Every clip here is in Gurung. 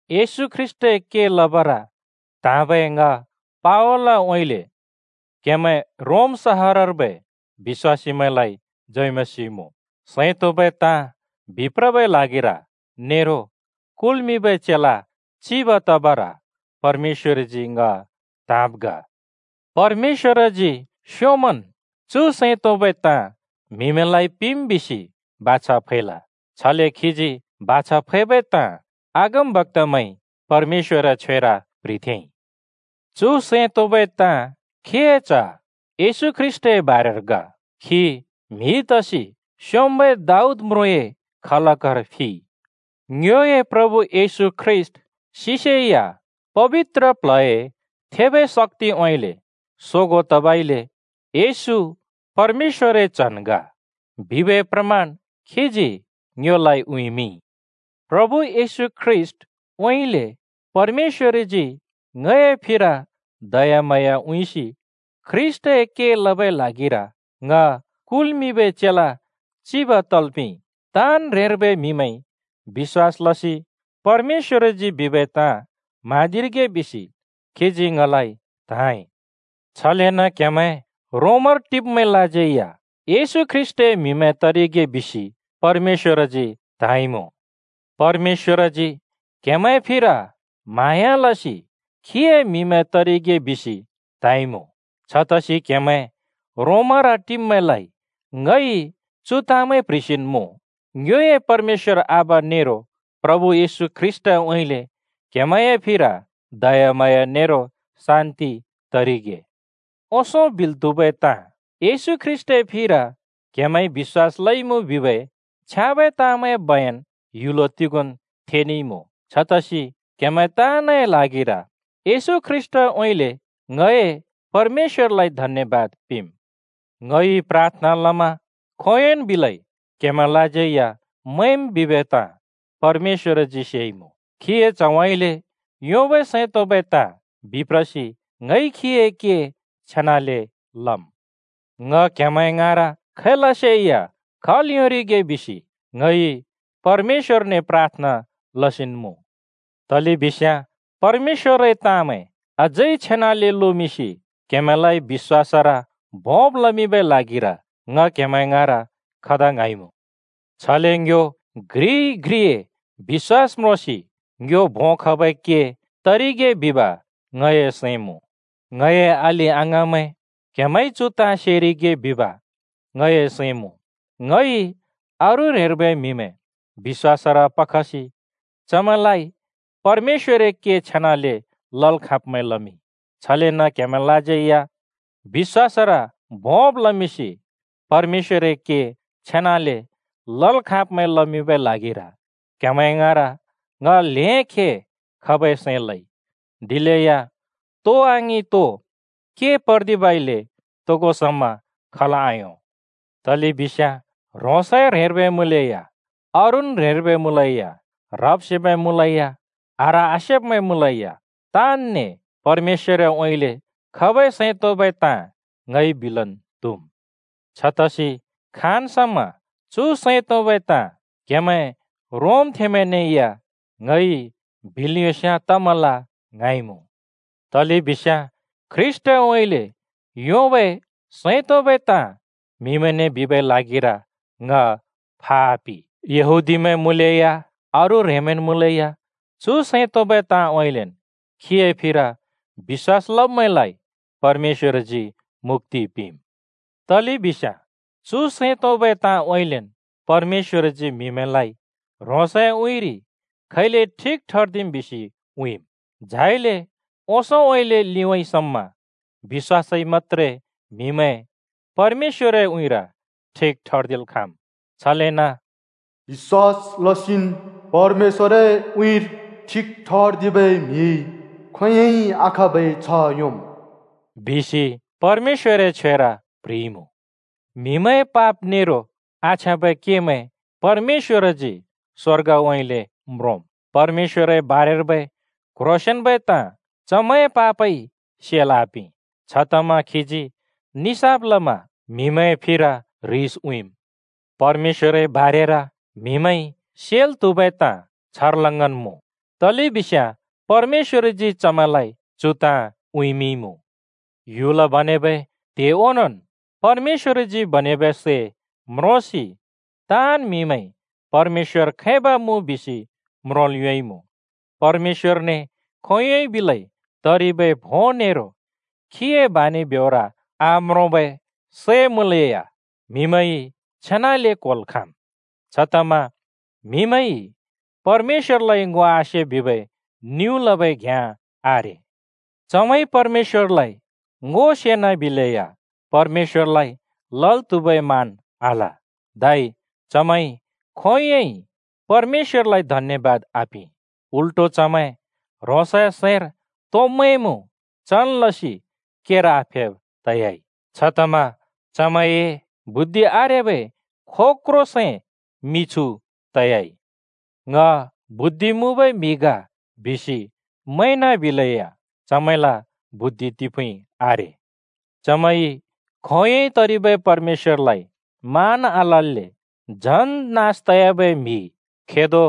येशू ख्रीष्‍टए के लबर त्हाँबै ङ पावलउँइँले क्हेमैं रोम सहरर्बै बिश्‍वासीमैंलाइ जय मसीह मुँ, सैं तोंबै ताँ बिप्रबै ल्हागिर नेरो कुल्मिंबै चेला चिब तबर परमेश्‍वरजी ङ त्‍हाँब् ग। परमेश्‍वरजी स्‍योंमन् चु सैं तोंबै ताँ म्‍हिमैंलाइ पिंम् बिसि बाछा फैल। छले खीजी बाछा फैबै ताँ अगमबक्‍तामैंइ परमेश्‍वरए छ्वेर प्‍ह्रिथेंइ। चु सैं तोंबै ताँ खीए च्‍ह येशू ख्रीष्‍टए बारेर ग। खी म्हि तसि स्‍योंम्‍बै दाऊद म्रुँए खलकर फिइ। ङ्योए प्रभु येशू ख्रीष्‍ट सिसेया पबित्र प्ल्हए थेबै शक्‍तिउँइँले सोगों तबइले “येशू परमेश्‍वरए च्‍हन् ग!” बिबै प्रमान खीजी ङ्योलाइ उँइँमिंइ। प्रभु येशू ख्रीष्‍टउँइँले परमेश्‍वरजी ङए फिर दयाम्हाँया उँइँसि ख्रीष्‍टए के लबै ल्हागिर ङ कुल्मिंबै चेला चिब तल् पिंइ। ताँन् ह्रेंर्बै म्‍हिमैंइ बिश्‍वास लसि परमेश्‍वरजी बिबै ताँ म्हाँदिरिगे बिसि खीजी ङलाइ त्‍हाँइ। छलेन क्‍हेमैं रोमर टिब्‍मैंलाज्यै या येशू ख्रीष्‍टए म्‍हिमैं तरिगे बिसि परमेश्‍वरजी त्‍हाँइमुँ। परमेश्‍वरजी क्‍हेमैंए फिर म्हाँया लसि खीए म्‍हिमैं तरिगे बिसि त्‍हाँइमुँ। छतसि क्‍हेमैं रोमर टिब्‍मैंलाइ ङइ चु ताँमैं प्‍ह्रिसिन् मुँ: ङ्योए परमेश्‍वर आबा नेरो प्रभु येशू ख्रीष्‍टउँइँले क्‍हेमैंए फिर दयाम्हाँया नेरो शान्‍ति तरिगे। ओंसों बिल् त्हुबै ताँ, येशू ख्रीष्‍टए फिर क्‍हेमैंइ बिश्‍वास लइमुँ बिबै छ्याँबै ताँमैंए बयन ह्‍युल तिगोंन् थेनेइमुँ। छतसि क्‍हेमैं ताँनए ल्हागिर येशू ख्रीष्‍टउँइँले ङए परमेश्‍वरलाइ धन्‍यबाद पिंम्। ङइ प्राथना लमा खोंयोंन् बिलै क्‍हेमैंलाज्यै मैंम् बिबै ताँ परमेश्‍वरजी सेइमुँ। खीए च्‍हउँइँले योंबै सैं तोंबै ताँ बिप्रसि ङइ खीए के छेनाले लम्। ङ क्‍हेमैं ङाँर खैलसेया खल् योंरिगे बिसेया ङइ परमेश्‍वरने प्राथना लसिन् मुँ। तलेबिस्याँ परमेश्‍वरए ताँमैं अझै छेनाले लोमिंसि क्हेमैंलाइ बिश्‍वासर भोंब् लमिंबै ल्हागिर ङ क्हेमैं ङाँर खदा ङ्हाँइमुँ। छले ङ्यो घ्रिइ घ्रिए बिश्‍वास म्रोंसि ङ्यो भों खबै के तरिगे बिब ङए सैं मुँ। ङए अलि-अङाँमैं, क्हेमैंइ चु ताँ सेरिगे बिब ङए सैं मुँ। ङइ अरू ह्रेंर्बै म्हिमैं बिश्‍वासर पखसि चमैंलाइ परमेश्‍वरए के छेनाले लल् खाँब्मैं लमिंइ। छलेन क्‍हेमैंलाज्यै बिश्‍वासर भोंब् लमिंसि परमेश्‍वरए के छेनाले लल् खाँब्मैं लमिंबै ल्हागिर क्हेमैं ङाँर ङ ल्हें खे खबै सैं लइ, दिलेया तो आङिं तो के पर्दिबइले तोगो समा खल् आयों। तलेबिस्याँ ह्रोंसए ह्रेंर्बै मुँलेया, अरून् ह्रेंर्बै मुँलेया, ह्रब् सेब्मैं मुँलेया, आह्र आसेब्मैं मुँलेया, ताँनने परमेश्‍वरउँइँले खबै सैं तोंबै ताँ ङइ बिलन् त्हुम्। छतसि खाँन् समा चु सैं तोंबै ताँ क्‍हेमैं रोमथेंमैंने या ङइ बिल् योंस्याँ तमल ङ्हाँइमुँ। तलेबिस्याँ ख्रीष्‍टउँइँले योंबै सैं तोंबै ताँ म्हिमैंने बिबै ल्हागिर ङ फा आपि। यहूदीमैं मुँलेया अरू ह्रेंमैंन् मुँलेया चु सैं तोंबै ताँउँइँलेन् खीए फिर बिश्‍वास लब्‍मैंलाइ परमेश्‍वरजी मुक्‍ति पिंम्। तलेबिस्याँ चु सैं तोंबै ताँउँइँलेन् परमेश्‍वरजी म्‍हिमैंलाइ ह्रोंसए उँइँरि खैले ठिक ठर्दिम् बिसि उँइँम्। झाइले ओंसोंउँइँले लिउँइँ समा बिश्‍वासइ मत्‍त्रे म्‍हिमैं परमेश्‍वरए उँइँर ठिक ठर्दिल् खाँम्। छलेन “बिश्‍वास लसिन् परमेश्‍वरए उँइँर ठिक ठर्दिबै म्हिइ खोंयोंइ आखाँबै छ्ह योंम्।” बिसि परमेश्‍वरए छ्वेर प्ह्रिइमुँ। म्‍हिमैंए पाप नेरो आछ्याँबै केमैं परमेश्‍वरजी स्‍वर्गउँइँले म्रोंम्। परमेश्‍वरए बारेर्बै क्ह्रोंसेंन्बै ताँ चमैंए पापइ सेल् आपिं। छतमा खीजी निसाफ लमा ह्रिस उँइँम्। परमेश्‍वरए बारेर म्‍हिमैंइ सेल् त्‍हुबै ताँ छर्लङ्गन् मुँ, तलेबिस्याँ परमेश्‍वरजी चमैंलाइ चु ताँ उँइँमिंइमुँ। ह्‍युल बनेबै त्हे ओनोंन् परमेश्‍वरजी बनेबै सै म्रोंसि ताँन् म्‍हिमैंइ परमेश्‍वर खैब मुँ बिसि म्रोंल् योंइमुँ। परमेश्‍वरने खोंयोंन् बिलै तरिबै भों नेरो खीए बानि ब्योर आम्रोंबै सै मुँलेया म्‍हिमैंइ छेनाले क्‍होल् खाँम्। छतमा म्‍हिइ परमेश्‍वरलाइ ङो आसे बिबै निउँ लबै घ्याँ आरे। चमैंइ परमेश्‍वरलाइ ङो सेनाबिलेया परमेश्‍वरलाइ लल् त्‍हुबै मान आल। धै चमैंइ खोंयोंइ परमेश्‍वरलाइ धन्‍यबाद आपिं, उल्‍टो चमैं ह्रोंसए सैंर तो मैंमुँ चन् लसि केर आफेब् तयाइ, छतमा चमैंए बुद्धि आरेबै खोक्रो सैं मिछु तयाइ। “ङ बुद्धि मुँबै म्हि ग” बिसि मैंनाबिलेया चमैंल बुद्धि तिफुँइ आरे। चमैंइ खोंयोंइ तरिबै परमेश्‍वरलाइ मान आलल्‍ले झन् नास तयाबै म्‍हि, खेदो,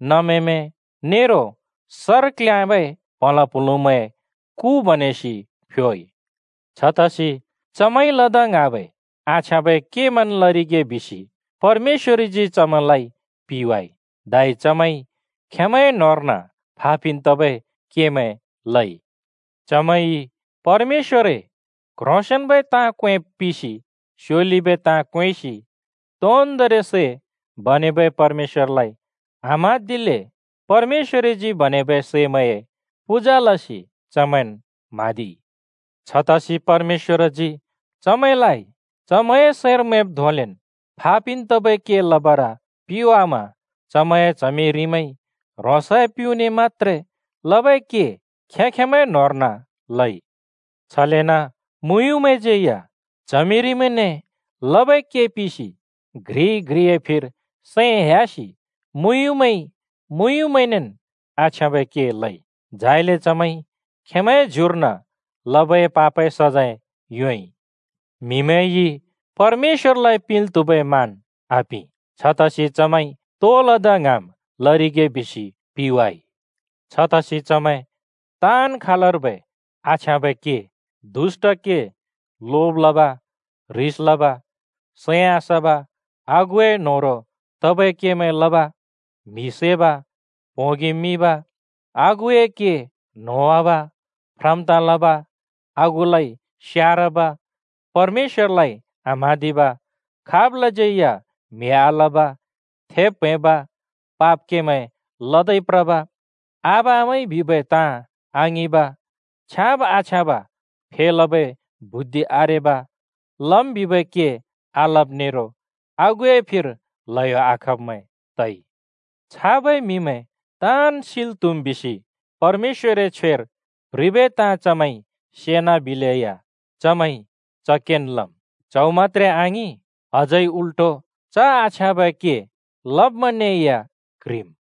नमेमैं नेरो सर क्‍ल्याँबै प्हलाँ प्हुलुँमैंए कु बनेसि फ्योइ। छतसि चमैंइ लदा ङ्हाँबै आछ्याँबै केमैंन् लरिगे बिसि परमेश्‍वरजी चमैंलाइ पिवाइ। धै चमैंइ खेंमैंए न्होंर्न फा पिन् तबै केमैं लइ। चमैंइ परमेश्‍वरए क्‍ह्रोंसेंन्‍बै ताँ क्‍वेंब् पिसि स्‍योलिबै ताँ क्‍वेंसि तोन्दोंरि सै बनेबै परमेश्‍वरलाइ आम्हाँदिल्‍ले परमेश्‍वरजी बनेबै सैमैंए पूजा लसि चमैंन् म्हाँदिइ। छतसि परमेश्‍वरजी चमैंलाइ चमैंए सैंर मैंब् धोंलेन् फापिन् तबै के लबर पिवामा चमैंए च्हमि रिमैंइ ह्रोंसए प्युँने मत्‍त्रे लबै के खें-खेंमैंए न्होंर्न लइ। छलेन मुँयुँमैंज्‍यै या च्हमिरिमैंने लबै के पिसि घ्रिइ घ्रिए फिर सैं ह्‍यासि मुँयुँमैंइ मुँयुँमैंनेन् आछ्याँबै के लइ। झाइले चमैंइ खेंमैंए ज्युर्न लबै पापए सजैं योंइ। म्‍हिमैंइ परमेश्‍वरलाइ पिंल् त्हुबै मान आपिं, छतसि चमैंइ तो लदा ङ्हाँम् लरिगे बिसि पिवाइ। छतसि चमैं ताँन् खालर्बै आछ्याँबै के, दुष्‍ट के, लोब लब, ह्रिस लब, सैं आसब, आगुए न्होह्रों तबै केमैं लब, म्हि सैब, प्होंगि मिब, आगुए के न्होंवाब, फ्रम् ताँ लब, आगुलाइ स्यारब, परमेश्‍वरलाइ आम्हाँदिब, खाबलाज्यै या म्‍हि आलब, थेब् प्‍हैंब, पाप केमैं लदै प्रब, आबा-आमाइ बिबै ताँ आङिंब, छ्याँब आछ्याँब फेलबै बुद्धि आरेब, लम् बिबै के आलब नेरो आगुए फिर ल्हयो आखब्मैं तइमुँ। छाबै म्‍हिमैं ताँन् सिल् त्हुम् बिसि परमेश्‍वरए छ्वेर प्ह्रिबै ताँ चमैंइ सेना बिलेया चमैंइ च केन् लम्। च्‍हौ मत्‍त्रे आङिं, अझै उल्‍टो च आछ्याँबै के लब्‍मैंने या क्ह्रिम्।